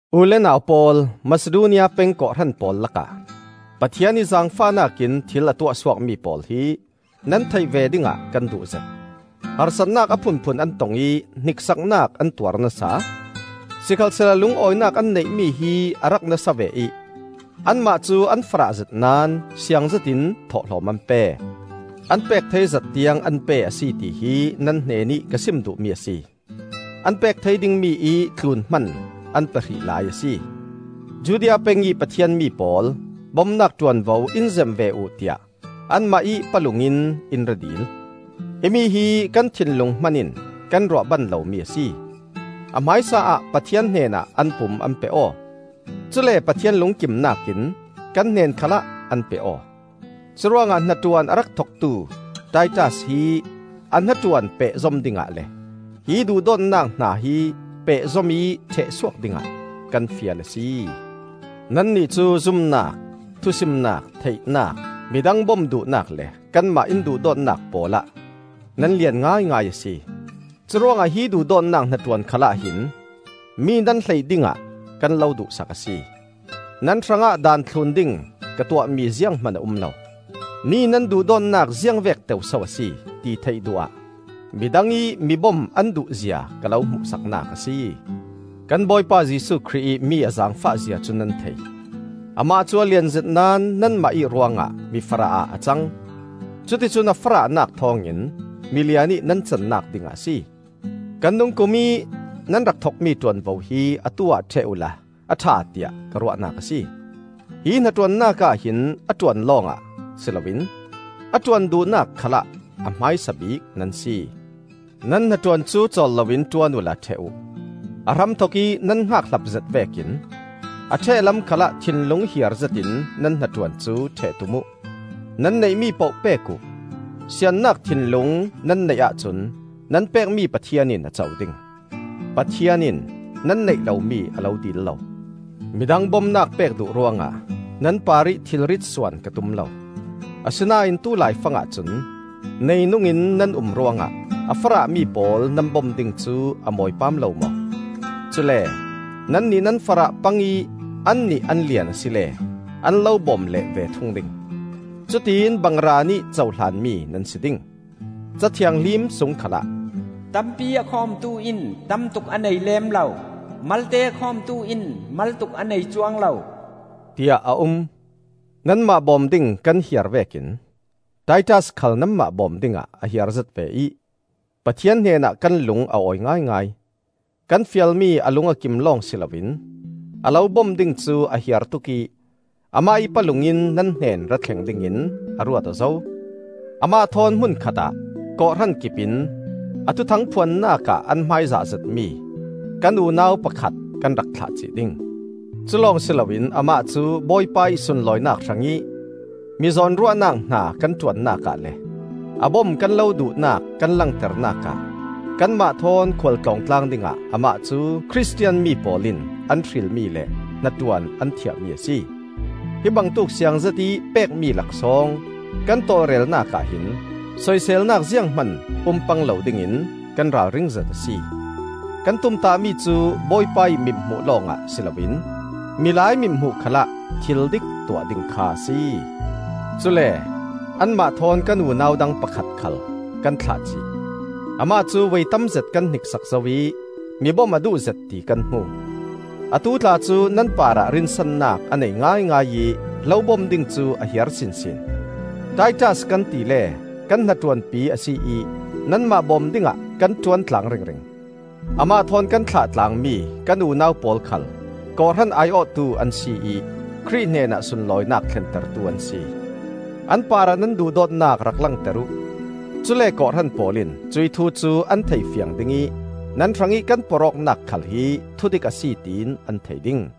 U le nau pawl, Masidonia peng kawhhran pawl lakah Pathian ih zaangfahnak in thil a tuahsuakmi pawl hi nan theih ve dingah kan duhzet. Harsatnak a phunphun an tong ih hniksaknak an tuar nasa; sikhalsehla lungawinak an neihmi hi a rak nasa ve ih anmah cu an farahzet naón siang zetin thawhlawm an pe. An pek thei zat tiang an pe a si tihi nan hnenih ka sim duhmi a si; an pek thei dingmi ih tlun hman an pe hrih lai a si. Judea pengih Pathian mi pawl bomnak ṭuanvo in zem ve uh tiah anmah ih palung in in ra dil. Himi hi kan thinlung hman in kan ruah ban lomi a si. A hmaisa ah Pathian hnenah an pum an pe aw; cule Pathian lungkimnak in kan hnen khalah an pe aw. Curuangah hnaṭuan a rak thoktu Titas hi a hnaṭuan pehzom dingah le hih duhdawtnak hna hi pehzom ih ṭhehsuak dingah kan fial a si. Nannih cu zumnak, thusimnak, theihnak, midang bom duhnak le kanmah in duhdawtnak pawlah nan lian ngaingai a si. Curuangah hi duhdawtnak hnaṭuan khalah hin mi nan hleih dingah kan lo duhsak a si. Nan hrangah daan thlun ding ka tuahmi zianghman a um lo. Mi nan duhdawtnak ziangvek teu so a si, ti theih duh ah midang ih mibom an duhzia ka lo hmuhsaknak a si. Kan Bawipa Jesuh Khrih ih mi a zaangfah zia cu nan thei: Amah cu a lianzet naón nanmah ih ruangah mi farah ah a cang; cuticun a farahnak thawng in milian ih nan cannak dingah a si. Kan dungkum ih nan rak thokmi ṭuanvo hi atu-ah ṭheh uhla a ṭha tiah ka ruahnak a si. Hi hnaṭuannak ahhin a ṭuan lawngah si loin a ṭuan duhnak khalah a hmaisa bik nan si. Nan hnaṭuan cu cawl loin ṭuan uhla ṭheh uh. A hramthok ih nan hngakhlapzet vekin a ṭheh lam khalah thinlung hiarzetin nan hnaṭuan cu ṭheh tum uh; nan neihmi poh pek uh. Siannak thinlung nan neih ahcun nan pekmi Pathian in a co ding; Pathian in nan neih lomi a lo dil lo. Midang bomnak pek duh ruangah nan parih thilrit suan ka tum lo. Asinain tulaifangah cun neinungin nan um ruangah a farahmi pawl nan bom ding cu a mawi paam lo maw? Cule nannih nan farah pang ih annih an lian asile an lo bawm leh ve thung ding. Cutiin bangraan ih cohlanmi nan si ding. Ca Thianghlim sung khalah, “Tampi a khawmtu in tamtuk a nei lem lo; malte a khawmtu in maltuk a nei cuang lo,” tiah a um. Nanmah bawm ding kan hiar vekin Titas khal nanmah bawm dingah a hiarzet ve ih Pathian hnenah kan lung a awi ngaingai. Kan fialmi a lung a kim lawng si loin a lo bom ding cu a hiar tuk ih amah ih palung in nan hnen rathleng dingin a ruat aw zo. Amah thawn hmun khatah kawhhran kipin a Thuthang phuannak ah an hmaizah zetmi kan unau pakhat kan rak thlah cih ding. Culawng si loin amah cu Bawipa ih sunlawinak hrangih mi zawnruahnak hna kan ṭuannak ah le a bom kan lo duhnak kan langternak ah kanmah thawn khual tlawng tlang dingah amah cu Khristian mi pawl in an hrilmi le hnaṭuan an thiahmi a si. Hi bangtuk siangzet ih pekmi laksawng kan tawlrelnak ah hin soiselnak zianghman um pang lo dingin kan ralringzet a si. Kan tumtahmi cu Bawipa ih mithmuh lawngah si loin milai mithmuh khalah thildik tuah ding kha a si. Cule anmah thawn kan unau dang pakhat khal kan thlah cih. Amah cu voi tamzet kan hniksak zo ih mi bom a duhzet ti kan hmu. Atu tla cu nan parah rinsannak a nei ngaingai ih lo bom ding cu a hiar sinsin. Titas kan tile kan hnaṭuanpi a si ih nanmah bawm dingah kan ṭuan tlang ringring; amah thawn kan thlah tlangmi kan unau pawl khal kawhhran ai-awhtu an si ih Khrih hnenah sunlawinak thlentertu an si. An parah nan duhdawtnak rak langter uh; cule kawhhran pawl in cuih thu cu an thei fiang ding ih nan hrangih kan porh awknak khal hi thudik a si tiin an thei ding.